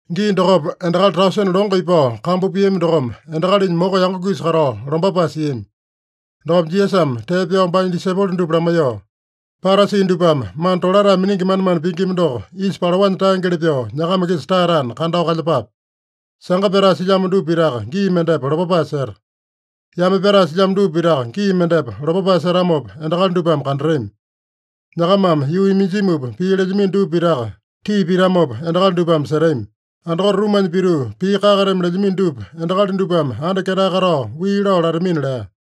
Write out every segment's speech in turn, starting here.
Gii dokopa, endakali tausene longo ipao kambu piami dokome, endakalinya moko yango-kisa katao lombapae siami. Dokopa Jisasame tee pyao baanya disaipolo dupa lamaiyoo, “Parasi dupame mana tolatae miningi manemane pingima doko yisa palaonya taengeli pyoo nyakama-kisa taeyatana, kandao kalyepape. Sanga pyatae silyamo dupa pitaka gii mendepa lopapae seta. Yame pyatae silyamo dupa pitaka gii mendepa lopapae setamopa, endakali dupame kandatami. Nyakamame yuu iminjumupa pii lelyamino dupa pitaka, tii pitamopa endakali dupame setami. Andakote rumanya pituu pii kakateame lelyamino dupa, endakali dupame anda ketae katao wii lao latamina” lea.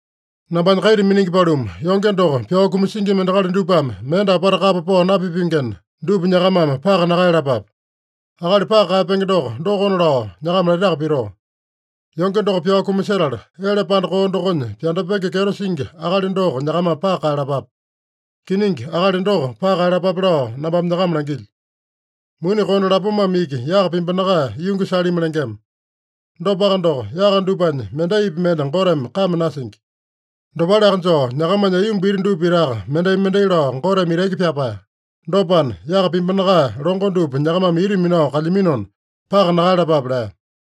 “Nambanya kaita miningi paluma, yonge doko pyao kumasingima endakali dupame mende apata kapa pao napipengena, dupa nyakamame paka nakaeyalapape. Akali paka kaeyapenge doko, dokona lao nyakama laitaka pitoo: Yonge doko pyao kumasetala, ele panda koo dokonya pyandapenge kyeto singi akali doko nyakamame paka kaeyalapape. Kiningi, akali doko paka kaeyalapape lao nambame nyakama langilyo. Muni konde lapomame iki yaka pimbinakae yungi salimi lengema. Dopaka doko, yaka dupanya mendaipi mende Goteme kame nasingi. Dopaleaka joo, nyakamanya aiyomba iti dupa pitaka mendai-mendai lao Goteme itaki pyapae. Dopana, yaka pimbinakae longo dupa nyakamame ita minao kalyaminona, paka nakaeyalapape” lea.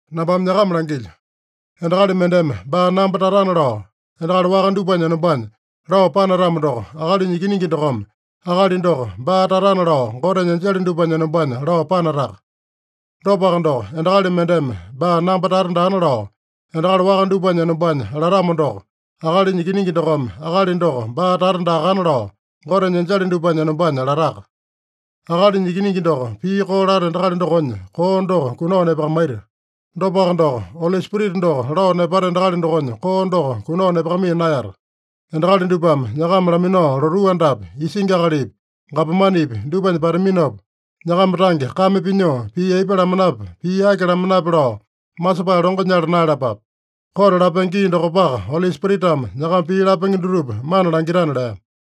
“Nambame nyakama langilyo: Endakali mendeme baa namba tatana lao, endakali waka dupanya enombanya lao panatamo doko, Akalinya Ikiningi dokome akali doko baa tatana lao, Gotenya enjele dupanya enombanya lao panataka. Dopaka doko, endakali mendeme baa namba tata daana lao, endakali waka dupanya enombanya latamo doko, Akalinya Ikiningi dokome akali doko baa tata daakana lao, Gotenya enjele dupanya enombanya lataka. Akalinya Ikiningi doko pii koo lata endakali dokonya koo doko kunao nepakamaita. Dopaka doko, Oli Spirita doko lao nepata endakali dokonya koo doko kunao nepakamaiya naeyata. Endakali dupame nyakama laminao lotuu andapi, isingi akalipi, gapomanepi dupanya pataminopa, nyakama tange kame pinyoo pii aipa lamanape, pii aki lamanape lao masepae longo nyala naeyalapape. Kote lapenge gii dokopaka Oli Spiritame nyakama pii lapenge dutupa mana langitana” lea.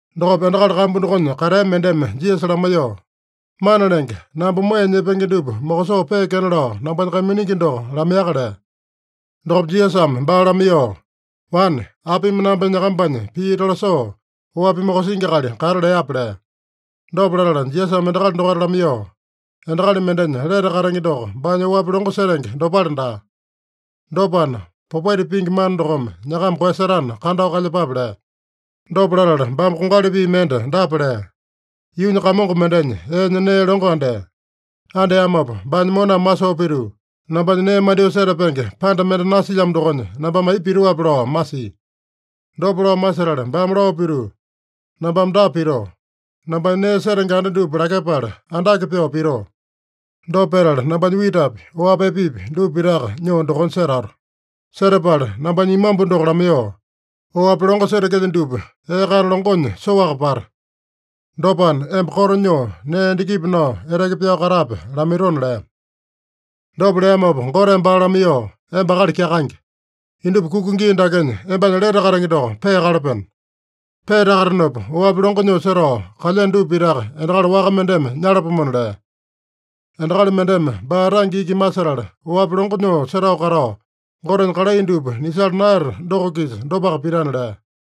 Dokopa endakali kambu dokonya katea mendeme Jisasa lamaiyoo, “Mana Lenge, namba moeya nyepenge dupa mokosoo peekena lao nambanya kaiminingi doko lamaiyaka” lea. Dokopa Jisasame baa lamaiyoo, “Wane, apimi namba nyakambanya pii tolasoo, oapi mokosingi akali kata leape?” lea. Dopa latala Jisasame endakali dokaita lamaiyoo, “Endakali mendenya lete katenge doko baanya oapi longo setenge dopale daa. Dopana, popaita pingi mana dokome nyakama koeyasetana, kandao kalyepape” lea. Dopa latala baame kongali pii mende dapa lea: “Yuunya kamongo mendenya eenya nee longo andea. Andeamopa baanya moname masoo pituu, ‘Nambanya nee mandyoo setapenge panda mende nasilyamo dokonya, nambame aipa pitoape?’ lao masia. Dopa lao masetala baame lao pituu, ‘Nambame dapa pitoo: Nambanya nee setenge anda dupa lakyepala andake pyoo pitoo. Dopa petala nambanya witapi, oapi epepi dupa pitaka nyoo dokonya setato. Setapala nambanya imambu doko lamaiyoo, “Oapi longo setekelyo dupa ee kana longonya soaka pata. Dopana, emba koto nyoo, nee endakipi nao, eteke pyao katape” lamaitona’ lea. Dopa leamopa Goteme baa lamaiyoo, ‘Emba akali kyakaenge! Indupa kuka gii dakenya embanya lete katenge doko peakalapeno. Peatakatenopa oapi longo nyoo setao kalyeno dupa pitaka endakali waka mendeme nyalapomona’ lea. Endakali mendeme baa tange iki masetala oapi longo nyoo setao katao, Gotenya kalai dupa nisala naeyata doko-kisa dopaka pitana” lea.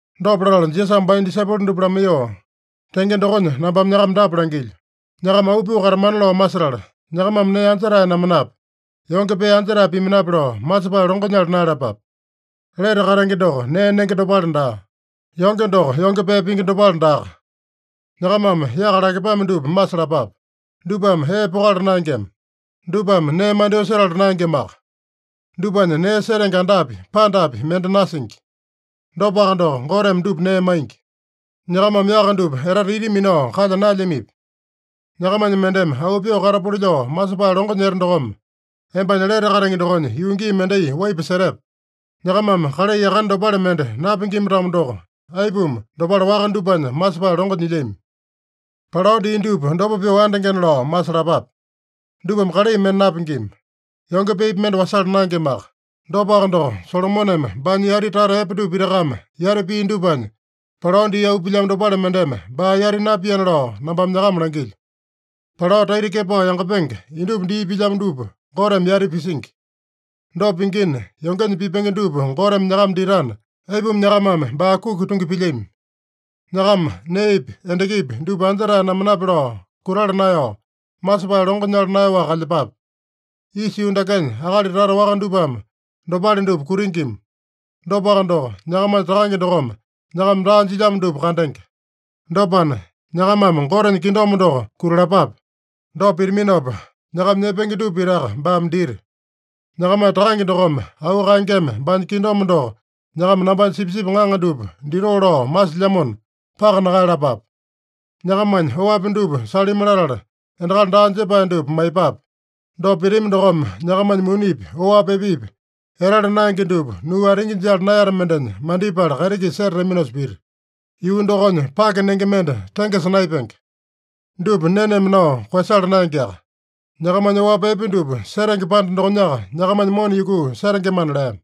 Dopa latala Jisasame baanya disaipolo dupa lamaiyoo, “Tenge dokonya nambame nyakama dapa langilyo: Nyakama auu pyoo katamana lao masetala, nyakamame nee anja-tae namanape, yonge pee anja-tae pimanape lao masepae longo nyala naeyalapape. Lete katenge doko nee nenge dopale daa. Yonge doko yonge pee pingi dopale daaka. Nyakamame yaka lakepame dupa masalapape. Dupame ee pokala naengema. Dupame nee mandyoo setala naengemaka. Dupanya nee setenge andapi, pandapi mende nasingi. Dopaka doko, Goteme dupa nee maingi. Nyakamame yaka dupa etete ita minao kalya naelyamipi? Nyakamanya mendeme auu pyoo katapuli lao masepae longo nyete dokome, embanya lete katenge dokonya yuu gii mendai waipa setepe? Nyakamame kalai yakane dopale mende napingima-tamo doko, aipuma dopale waka dupanya masepae longo nyilyami? Palao dii dupa dopa pyoo andengena lao masalapape. Dupame kalai mende napingima. Yonge peepi mende wasala naengemaka. Dopaka doko, Solomoneme baanya yati tata epe dupa pitakame yati pia dupanya, palao dii auu pilyamo dopale mendeme baa yati napiana lao nambame nyakama langilyo. Palao taita kepao yangapenge, indupa dii pilyamo dupa Goteme yati pisingi. Dopa pingina, yongenya pipenge dupa Goteme nyakama ditana, aipuma nyakamame baa kuki tungi pilyami? Nyakama neepi, endakipi dupa anja-tae namanape lao kutala naeyao, masepae longo nyala naeyaowaka kalyepape. Isa yuu dakenya akali tata waka dupame dopale dupa kutingima. Dopaka doko, nyakamanya Takange dokome nyakama daa jilyamo dupa kandenge. Dopana, nyakamame Gotenya kingdom doko kutalapape. Dopa pitaminopa, nyakama nyepenge dupa pitaka baame dita. Nyakamanya Takange dokome auu kaengeme baanya kingdom doko nyakama nambanya sipisipi ŋaŋa dupa ditoo lao masilyamona, paka nakaeyalapape. Nyakamanya oapi dupa salimi latala, endakali daa jepae dupa maiyepape. Dopa pitami dokome, nyakamanya munipi, oapi epepi, etala naenge dupa nuu atingi jala naeyata mendenya mandipala kaiti-kisa setataminosa pita. Yuu dokonya pake nenge mende tengesa naepenge. Dupa neneme nao koeyasala naengeaka. Nyakamanya oapi epe dupa setenge panda dokonyaka nyakamanya mona yukuu setengemana” lea.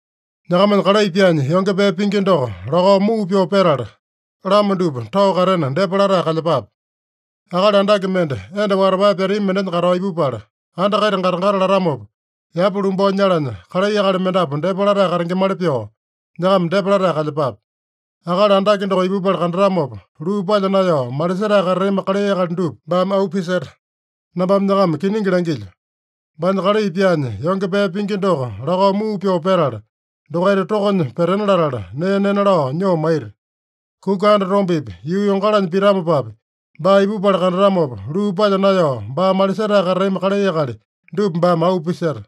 “Nyakamanya kalai pyaanya yonge pee pingi doko lakao muu pyoo petala, lama dupa tao katena depa latae kalyepape. Akali andake mende, enda watapae pyatami mendenya katao ipupala, anda kaita gata-gata latamopa, yapa lumbao nyalanya kalai akali mendapu depa latae katengemali pyoo nyakama depa latae kalyepape. Akali andake doko ipupala kandatamopa, luu palya naeyao malisetae katatami kalai akali dupa baame auu piseta. Nambame nyakama kiningi langilyo: Baanya kalai pyaanya yonge pee pingi doko lakao muu pyoo petala, dokaita tokonya petena latala nee nena lao nyoo maita. Kuka andatombepi, yuu yongalanya pitamopapi, baa ipupala kandatamopa, luu palya naeyao baa malisetae katatami kalai akali dupa baame auu piseta.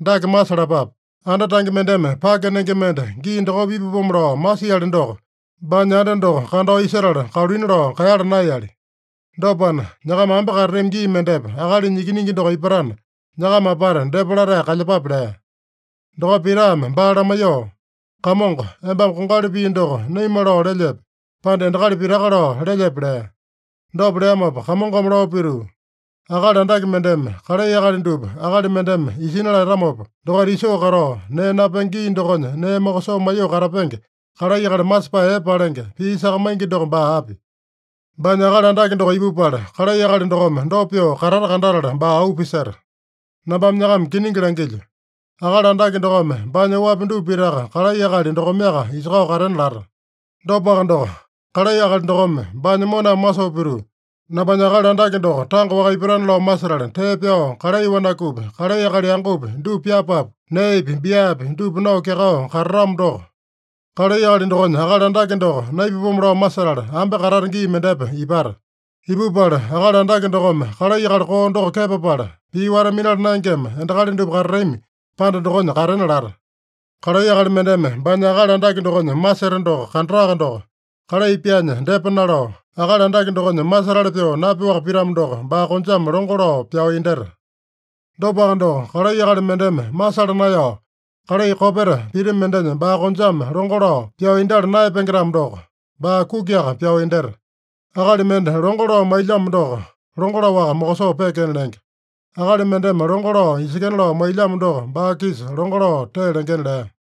Dake masalapape: Anda tange mendeme pake nenge mende gii dokopa ipapomo lao masiali doko, baanya anda doko kandao isetala, kaluina lao kaeyala naeyali. Dopana, nyakama ambe katatami gii mendepa Akalinya Ikiningi doko ipatana, nyakama apata depa latae kalyepape” lea. Dokopa Pitame baa lamaiyoo, “Kamongo, embame kongali pii doko naima lao lelyepe, pande endakali pitaka lao lelyepe?” lea. Dopa leamopa Kamongome lao pituu, “Akali andake mendeme kalai akali dupa akali mendeme isina latamopa, dokaita isoo katao, nee napenge gii dokonya nee mokosoo maiyoo katapenge kalai akali masepae epe palenge, pii sakamaingi doko baa api? Baanya akali andake doko ipupala, kalai akali dokome dopa pyoo katata kandatala, baa auu piseta. Nambame nyakama kiningi langilyo: Akali andake dokome baanya oapi dupa pitaka kalai akali dokomeaka isakao katena lata. Dopaka doko, kalai akali dokome baanya moname masoo pituu, ‘Nambanya akali andake doko tanga-waka ipatana’ lao masetala, tee pyao kalai wanakupi, kalai akali yangopi dupa pyapapu, neepi, biapi dupa nao kyakao katatamo doko, kalai akali dokonya akali andake doko naipapomo lao masetala, ambe katata gii mendepa ipata. Ipupala akali andake dokome kalai akali koo doko kepapala, pii wata-minala naengema endakali dupa katatami panda dokonya katena lata. Kalai akali mendeme baanya akali andake dokonya maseta doko kandataka doko, kalai pyaanya depa nalao, akali andake dokonya masetali pyoo napyoaka pitamo doko, baa konjame longo lao pyao indyeta. Dopaka doko, kalai akali mendeme masala naeyao, kalai kopeta pita mendenya baa konjame longo lao pyao indyala naeyapenge-tamo doko, baa kukiaka pyao indyeta. Akali mende longo lao mailyamo doko, longo laowaka mokosoo peekena lenge. Akali mendeme longo lao isekena lao mailyamo doko, baa-kisa longo lao tee lengena” lea.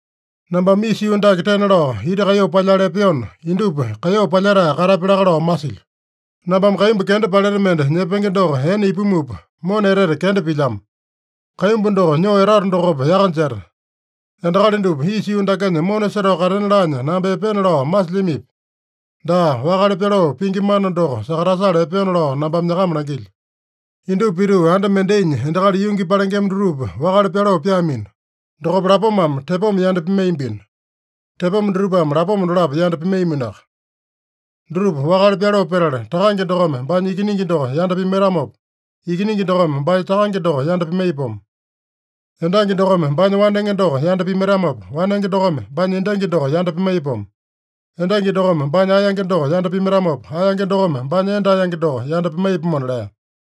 “Nambame isa yuu dake tena lao ita kaiyoo palyala epeona, indupa kaiyoo palyetae katapya laka lao masilyo. Nambame kaimbu kenda paleta mende nyepenge doko ene ipumupa, mona etete kenda pilyamo. Kaimbu doko nyoo etato dokopa yaka jeta. Endakali dupa isa yuu dakenya mona setao katena laanya namba epeena lao masilyamipi? Daa, wakale pyaloo pingi mana doko sakatasala epeona lao nambame nyakama langilyo. Indupa pituu, anda mendainya endakali yungi palengema dutupa wakale pyaloo pyaamino. Dokopa lapomame tepoma yanda pimaiyambino. Tepoma dutupame lapoma dolapo yanda pimaiyaminoaka. Dutupa wakale pyaloo petala, takange dokome baanya ikiningi doko yanda pimaitamopa, ikiningi dokome baanya takange doko yanda pimaiyapomo. Endangi dokome baanya wanenge doko yanda pimaitamopa, wanenge dokome baanya endangi doko yanda pimaiyapomo. Endangi dokome baanya aeyange doko yanda pimaitamopa, aeyange dokome baanya enda aeyange doko yanda pimaiyapomona” lea.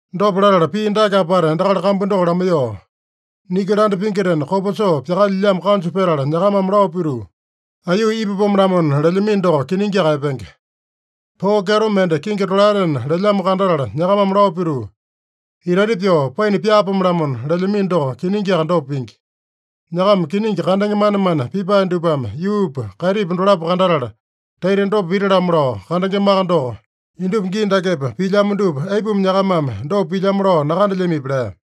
Dopa latala pii dake apata endakali kambu doko lamaiyoo, “Niki landa pingitena kopa soo pyakalyilyamo kanju petala nyakamame lao pituu, ‘Aiyuu ipapome-lamona’ lelyamino doko, kiningiaka epenge. Poo kyeto mende kingi tolaetena lelyamo kandatala nyakamame lao pituu, ‘Itaita pyoo paina pyaapome-lamona’ lelyamino doko, kiningiaka dopa pingi. Nyakama kiningi kandenge manemane pipae dupame yuupa, kaitipa dolapo kandatala, taita dopa pita-lamo lao kandengemaka doko, indupa gii dakepa pilyamo dupa aipuma nyakamame dopa pilyamo lao nakandelyamipi?” lea.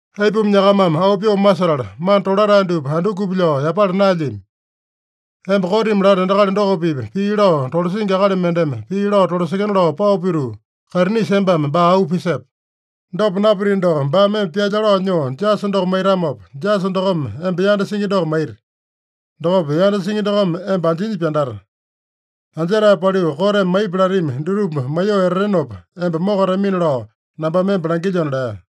“Aipuma nyakamame auu pyoo masetala, mana tolatae dupa andukupi lao yapala naelyami? Emba kotimi lata endakali doko-pipa pii lao tolasingi akali mendeme pii lao tolasekena lao pao pituu, kaitinisa embame baa auu pisepe. Dopa napitino doko, baame emba pyalya lao nyoo jasa doko maitamopa, jasa dokome emba yanda singi doko maita. Dokopa yanda singi dokome emba anjinya pyandata. Anjetae paliu, koteme maipi latami dutupa maiyoo etatenopa, emba mokatamina lao nambame emba langilyona” lea.